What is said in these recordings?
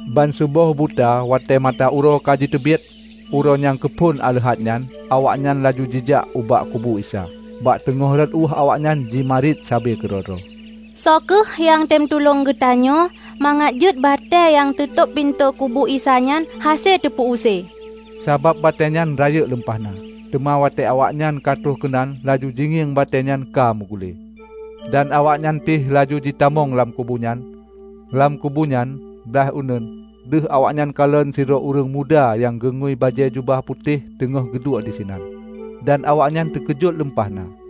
Ban seuboh buta watée mata uroe ka jiteubiet, uroe nyang keuphon aleuhat nyan, awaknyan laju jijak ubak kubu Isa. Bak teungoh rot ueh awaknyan jimarit sabe keudroe-droe, "Soe kheueh nyang tem tulông tanyoe mangat jeuet batée nyang teutôb pintoe kubu Isa nyan hase teupeusée?" Sabab batée nyan rayeuk lumpah na. Teuma watée awaknyan ka troh keunan laju jingieng batée nyan ka meugule. Dan awaknyan pih laju jitamong lam kubu nyan. Lam kubu nyan, blaih uneuen, deuh awaknyan kalon sidroe ureuëng muda nyang geungui bajée jubah putéh teungoh geuduek disinan, dan awaknyan teukeujot lumpah na.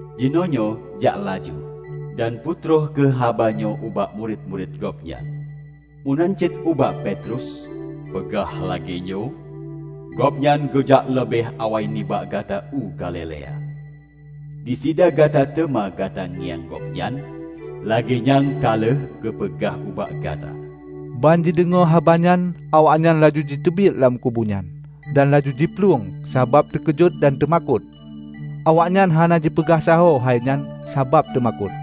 Jinoenyoe jak laju, dan peutroh kheueh haba nyoe ubak murit-murit Gobnyan, meunan cit ubak Petrus, peugah lagée nyoe, 'Gobnyan geujak leubeh awai nibak gata u Galilea. Disideh gata teuma gata ngieng gobnyan, lagée nyang ka lheueh geupeugah ubak gata.' " Ban jideungoe habanyan awaknyan laju jiteubiet lam kubu nyan dan laju jiplueng sabab teukeujot dan teumakot. Awaknyan hana jipeugah sahoe hai nyan sabab teumakot.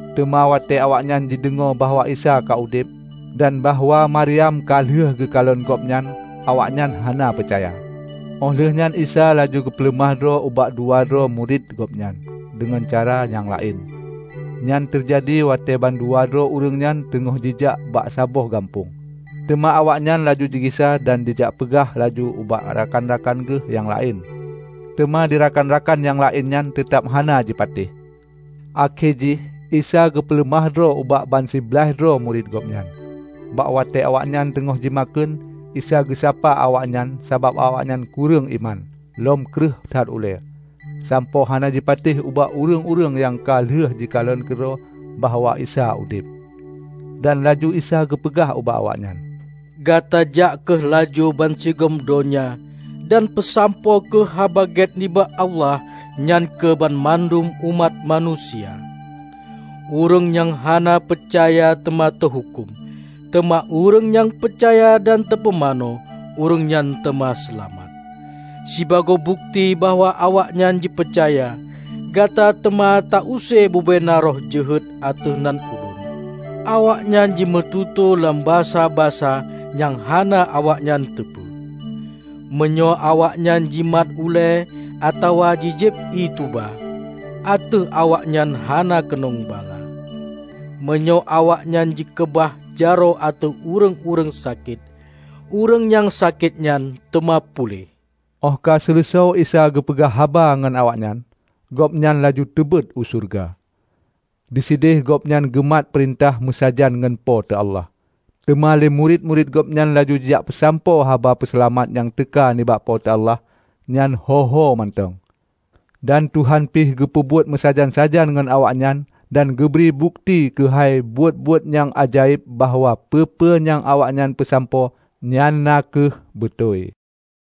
Teuma watée awaknyan deungoe bahwa Isa ka udeb, dan bahwa Maryam ka lheueh geukalon Gobnyan awaknyan hana peucaya. Óh lheueh nyan Isa laju geupeuleumah droe ubak dua droe murit Gobnyan deungon cara nyang laén. Nyan teujadi watée ban dua droe ureuëng nyan teungoh jijak bak saboh gampông. Teuma awaknyan laju jigisa dan jijak peugah laju ubak rakan-rakan geuh nyang laén. Teuma di rakan-rakan nyang laén nyan teutab hana jipatéh. Akhé jih, Isa geupeuleumah droe ubak ban siblaih droe murit Gobnyan, bak watée awaknyan teungoh jimakheun. Isa geusapa awaknyan sabab awaknyan kureueng iman lom kreueh that ulée sampoe hana jipatéh ubak ureuëng-ureuëng nyang ka lheueh jikalon keudroe bahwa Isa udeb. Dan laju Isa geupeugah ubak awaknyan, "Gata jak kheueh laju bansigom donya dan peusampoe kheueh Haba Gét nibak Allah nyan keu banmandum umat manusia. Ureuëng nyang hana peucaya teuma teuhuköm. Teuma ureuëng nyang peucaya dan teupumanö, ureuëng nyan teuma seulamat. Sibagoe bukeuti bahwa awaknyan jipeucaya, gata teuma ta use bubena roh jeuhet ateueh nan Ulôn; awaknyan jimeututoe lam basa-basa nyang hana awaknyan teupeu. Meunyoe awaknyan jimat uleue atawa ji jieb ié tuba, ateueh awaknyan hana keunong bala. Meunyoe awaknyan jikeubah jaroe ateueh ureuëng-ureuëng sakét, ureuëng nyang sakét nyan teuma puléh." Óh ka seuleusoe Isa geupeugah haba ngon awaknyan, Gobnyan laju teubeuôt u syeuruga. Disideh gobnyan geumat peurintah meusajan ngon Po teu Allah. Teuma le murit-murit Gobnyan laju jijak peusampoe haba seulamat nyang teuka nibak Po teu Allah nyan ho-ho mantong. Dan Tuhan pih geumubuet meusajan-sajan ngon awaknyan dan geubri bukeuti keuhai buet-buet nyang ajaéb bahwa peue-peue nyang awaknyan peusampoe nyan na kheueh beutôi.